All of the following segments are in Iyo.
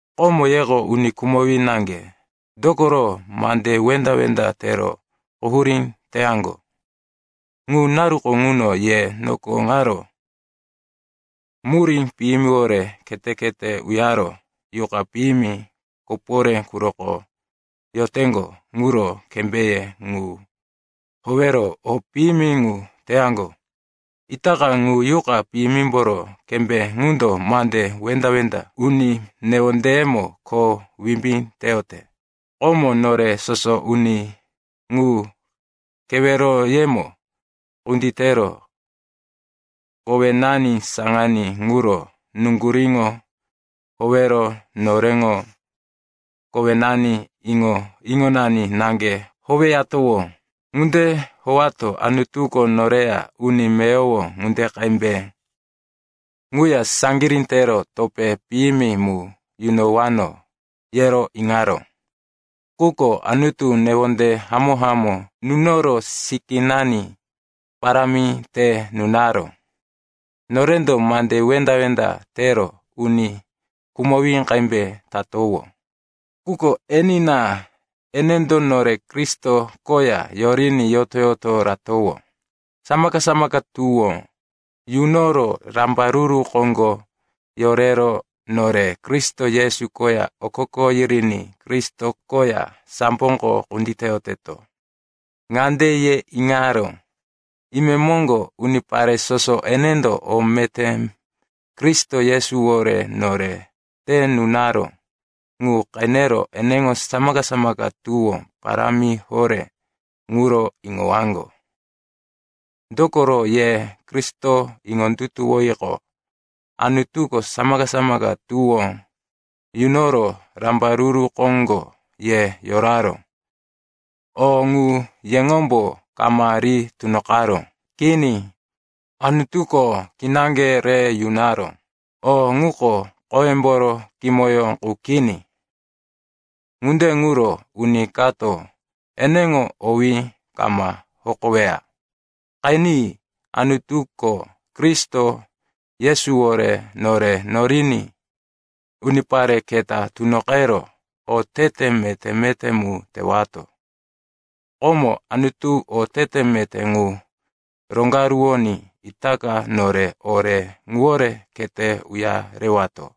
Komo yeko uni khumowí naŋge, dokoro mande wenda-wenda tero quhurí teyaŋgo. Ŋu naruko ŋuno ye noko ŋaro murí piyimiwore khete-khete uyaro yuqa piyimi koporé quroko yoteŋgo ŋuro kembéye ŋu howero o piyimi ŋu teyaŋgo. Itaka ŋu yuqa piyimimboro kembé ŋundo mande wenda-wenda uni newondeyemo kho wimbí teyote. Komo nore soso uni ŋu keweroyemo kunditero kowenani saŋaní ŋuro nuŋguríŋo howero noreŋo kowenani, iŋo-iŋonani naŋge howeyatowó. Ŋunde howato Anutuko noreya uni meyowo ŋunde qembe quya saŋgirí tero topé piyimi mu yunowano, yero iŋaró. Quko Anutuko newonde hamó-hamó nunoro sikínani parámi te nunaró. Norendo mande wenda-wenda tero uni khumowí qembe tatowó, quko enina, enendo nore Kristo koya yoriní yoto-yoto ratowó. Samaka-samaka tuwó yunoro rambaruru koŋgo yorero nore Kristo Yesu koya okoko yiriní Kristo koya samboko kunditeyoteto. Ŋande ye iŋaró, imemoŋgo unipare soso enendo o meté Kristo Yesuwore nore te nunaró ŋu qenero eneŋo samaka-samaka tuwó parámi horé ŋuro iŋowaŋgo. Dokoro ye Kristo iŋondutuwoyiqo, Anutuko samaka-samaka tuwó yunoro rambaruru koŋgo ye yoraró. O ŋu yeŋombo kama ri tunoqaró. Kini. Anutuko kinaŋge re yunaró. O ŋuko khoyemboro kimoyó qu kini. Ŋunde ŋuro uni kato eneŋo owí kama hokoweya. Qeni, Anutuko Kristo Yesuwore nore noriní unipare keta tunoqero otete meté-meté mu tewato. Komo Anutuko otete meté ŋu roŋgaruwoní itaka nore ore ŋuwore khete uyarewato.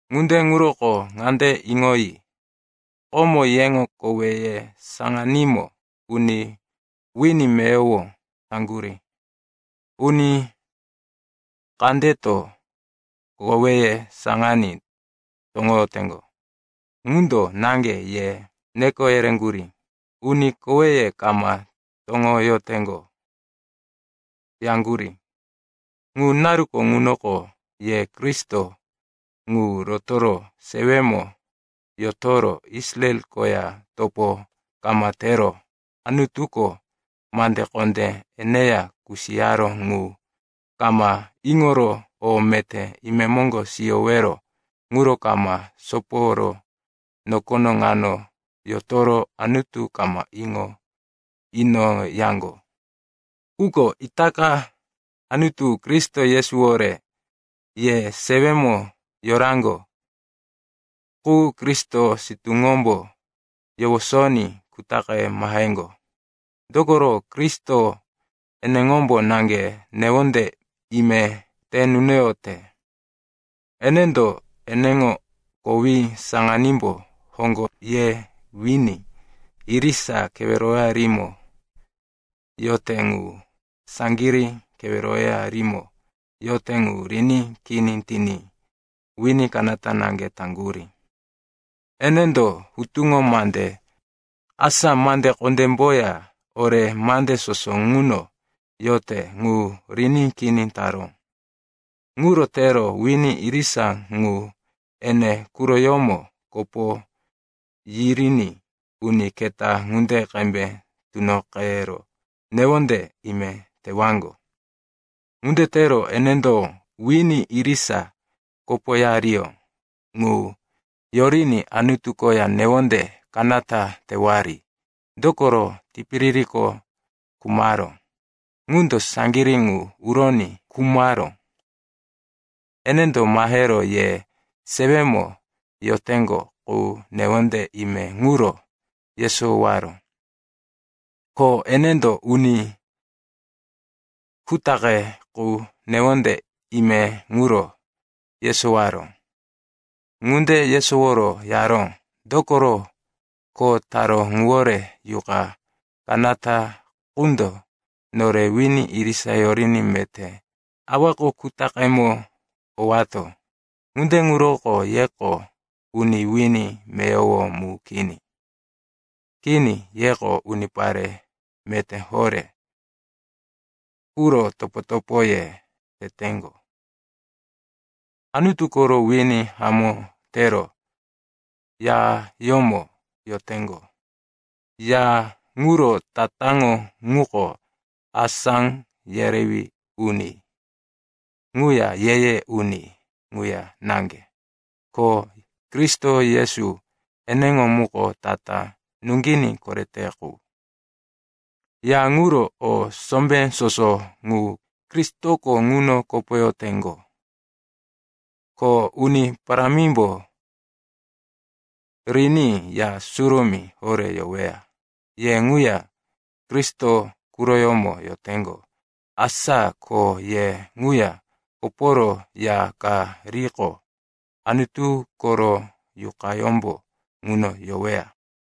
Ŋunde ŋuroko ŋande iŋoyi. Komo yeŋo koweye saŋanímo uni wini meyowo taŋgurí. Uni kandeto koweye saŋaní toŋoyoteŋgo ŋundo ŋande ye neko yereŋgurí, “Uni koweye kama toŋoyoteŋgo,” yaŋgurí. Ŋu naruko ŋunoko ye Kristo ŋu roto sewemo yotoro Israel koya topo kama tero Anutuko mande kondé eneya kusiyaró ŋu kama iŋoro o meté imemoŋgo siyowero ŋuro kama soporo nokono ŋano yotoro Anutu kama iŋo inoyaŋgo. Quko itaka, Anutuko Kristo Yesuwore ye sewemo yoraŋgo qu Kristo sitúŋombo yowosoní kutaqe maheŋgo. Dokoro Kristo eneŋombo naŋge newonde ime te nunoyote. Enendo eneŋo kowí saŋanímbo hoŋgo ye wini irisa keweroyarimo yote ŋu, saŋgirí keweroyarimo yote ŋu, riní kini tiní wini kanata naŋge taŋgurí. Enendo hutuŋo mande, asa mande kondémboya ore mande soso ŋuno yote ŋu, riní kini taró. Ŋuro tero wini irisa ŋu ene quroyómo kopo yiriní uni keta ŋunde qembe tunoqero newonde ime tewaŋgo. Ŋunde tero enendo wini irisa kopoyariyó ŋu yoriní Anutu koya newonde kanata tewari, dokoro tipiririko khumaró ŋundo saŋgirí ŋu uroní khumaró. Enendo mahero ye sewemo yoteŋgo qu newonde ime ŋuro yesowaró, ko enendo uni kutaqe qu newonde ime ŋuro yesowaró. Ŋunde yesoworo yaró, dokoro kho taró ŋuwore Yuqa kanata qundo nore wini irisa yoriní meté Awako kutaqemo owato. Ŋunde ŋuroko yeko uni wini meyowo mu kini. Kini, yeko unipare meté horé quro topo-topoye teteŋgo, Anutu koro wini hamó tero yayómo yoteŋgo. Ya ŋuro tatáŋo ŋuko asá yerewí uni ŋuya ye-ye uni ŋuya naŋge, ko Kristo Yesu eneŋo muko tatá nuŋginí korete qu. Ya ŋuro o sombé soso ŋu Kristoko ŋuno kopoyoteŋgo, ko Uni Parámimbo riní Ya Surumí horé yoweya. Ye ŋuya Kristo quroyómo yoteŋgo, asa ko ye ŋuya koporo ya ka riqo, Anutu koro Yuqayómbo ŋuno yoweya.